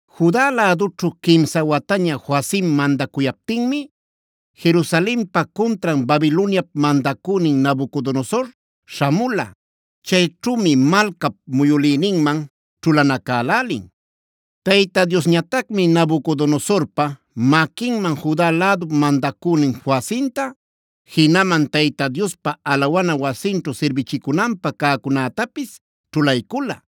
Juda lädućhu quimsa wataña Joacim mandacuyaptinmi Jerusalenpa cuntran Babiloniap mandacünin Nabucodonosor śhamula. Chayćhümi malcap muyülïninman ćhulanacälälin. Tayta Diosñatacmi Nabucodonosorpa maquinman Juda lädup mandacünin Joacimta, jinaman Tayta Diospa alawana wasinćhu sirbichicunanpä cäcunätapis ćhulaycula.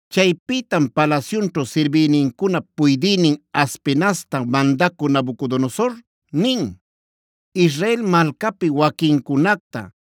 Chaypïtam palasyunćhu sirbïnincunap puydïnin Aspenazta mandacü Nabucodonosor nin: “Israel malcapi waquincunacta,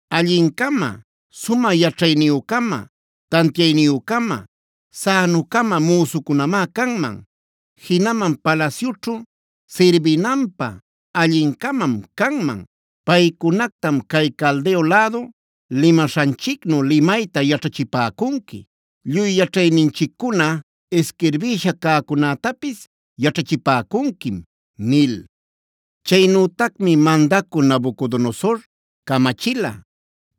Allin-cama, sumä yaćhayniyü-cama, tantiayniyü-cama, sänu-cama müsucunamá canman; jinaman palasyućhu sirbinanpä allin-camam canman. Paycunactam cay Caldeo lädu limaśhanchicnu limayta yaćhachipäcunqui; lluy yaćhayninchiccuna isquirbïsha cäcunätapis yaćhachipäcunquim” nil. Chaynütacmi mandacü Nabucodonosor camachila: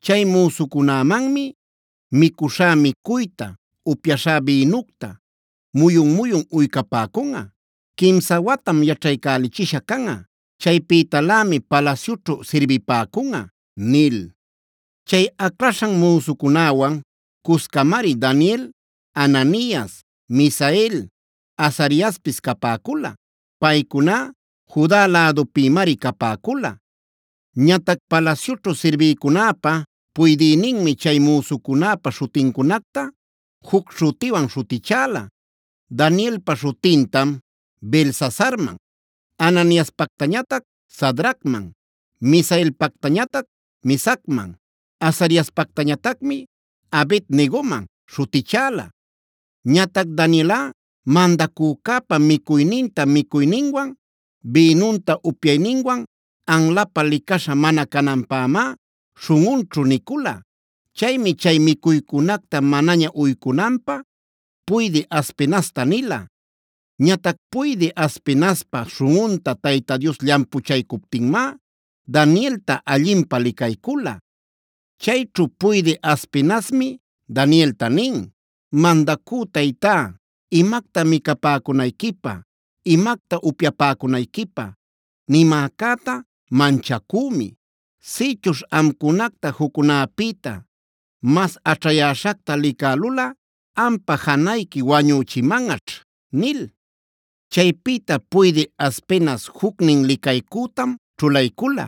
“Chay müsucunämanmi micuśhá micuyta, upyaśhá bïnucta muyun-muyun uycapäcunꞌa. Quimsa watam yaćhaycälichisha canꞌa. Chaypïtalämi palasyućhu sirbipäcunꞌa” nil. Chay aclaśhan müsucunäwan cuscamari Daniel, Ananias, Misael, Azariaspis capäcula. Paycuná Juda lädupïmari capäcula. Ñatac palasyućhu sirbïcunäpa puydïninmi chay müsucunäpa śhutincunacta juc śhutiwan śhutichäla: Danielpa śhutintam Beltsasarman, Ananiaspactañatac Sadracman, Misaelpactañatac Mesacman, Azariaspactañatacmi Abed-negoman śhutichäla. Ñatac Danielꞌa mandacücäpa micuyninta micuyninwan, bïnunta upyayninwan anlapä licaśha mana cananpämá śhunꞌunćhu nicula. Chaymi chay micuycunacta manaña uycunanpä puydï Aspenazta nila. Ñatac puydï Aspenazpa śhunꞌunta Tayta Dios llampuchaycuptinmá Danielta allinpä licaycula. Chayćhu puydï Aspenazmi Danielta nin: “Mandacü taytá, imacta micapäcunayquipä, imacta upyapäcunayquipä nimäcäta manchacümi. Sïchuśh amcunacta juccunäpïta mas aćhayäśhacta licälulꞌa, ampa janayqui wañüchimanꞌaćh” nil. Chaypïta puydï Aspenaz jucnin licaycütam ćhulaycula,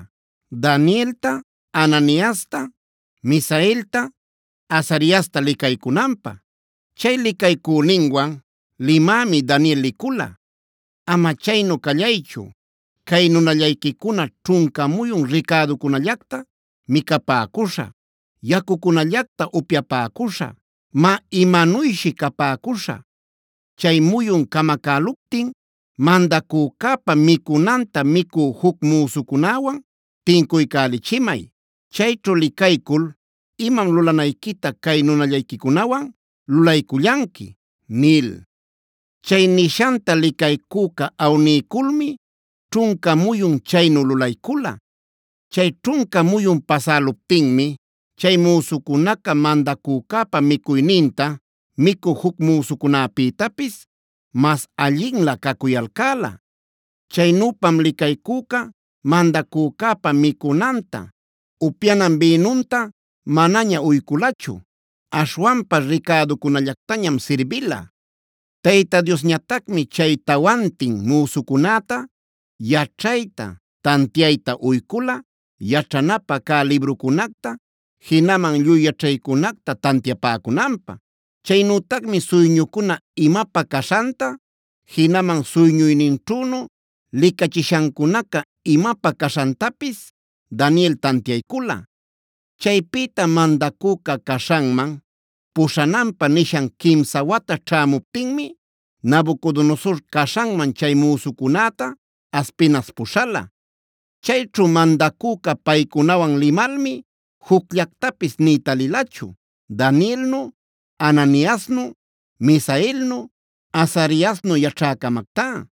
Danielta, Ananiasta, Misaelta, Azariasta licaycunanpä. Chay licaycüninwan limämi Daniel licula: “Ama chaynu callaychu, cay nunallayquicuna ćhunca muyun ricäducunallacta micapäcuśhä, yacucunallacta upyapäcuśhä. Má imanuyshi capäcuśhä. Chay muyun camacäluptin mandacücäpa micunanta micü juc müsucunäwan tincuycälichimay. Chayćhu licaycul imam lulanayquita cay nunallayquicunawan lulaycullanqui” nil. Chay nishanta licaycüca awniyculmi ćhunca muyun chaynu lulaycula. Chay ćhunca muyun pasäluptinmi chay müsucunaca mandacücäpa micuyninta micü juc müsucunäpïtapis mas allinlä cacuyalcäla. Chaynüpam licaycüca mandacücäpa micunanta, upyanan bïnunta manaña uyculachu. Aśhwanpa ricäducunallactañam sirbila. Tayta Diosñatacmi chay tawantin müsucunäta yaćhayta, tantiayta uycula yaćhanapä cä librucunacta, jinaman lluy yaćhaycunacta tantiapäcunanpä. Chaynütacmi suyñucuna imapä caśhanta, jinaman suyñuyninćhünu licachishancunaca imapä caśhantapis Daniel tantiaycula. Chaypïta mandacüca caśhanman puśhananpä nishan quimsa wata ćhämuptinmi Nabucodonosor caśhanman chay müsucunäta Aspenaz puśhala. Chayćhu mandacüca paycunawan limalmi jucllactapis nï talilachu Danielnu, Ananiasnu, Misaelnu, Azariasnu yaćhä-camactá.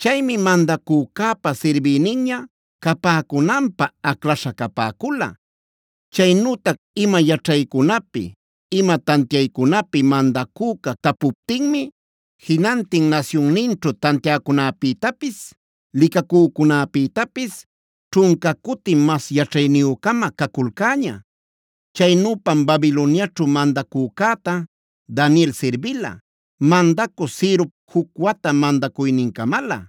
Chaymi mandacücäpa sirbïninña capäcunanpä aclaśha capäcula. Chaynütac ima yaćhaycunapi, ima tantiaycunapi mandacüca tapuptinmi jinantin nasyunninćhu tantiäcunäpïtapis, licacücunäpïtapis ćhunca cuti mas yaćhayniyü-cama caculcäña. Chaynüpam Babiloniaćhu mandacücäta Daniel sirbila, mandacü Cirop juc wata mandacuynincamalä.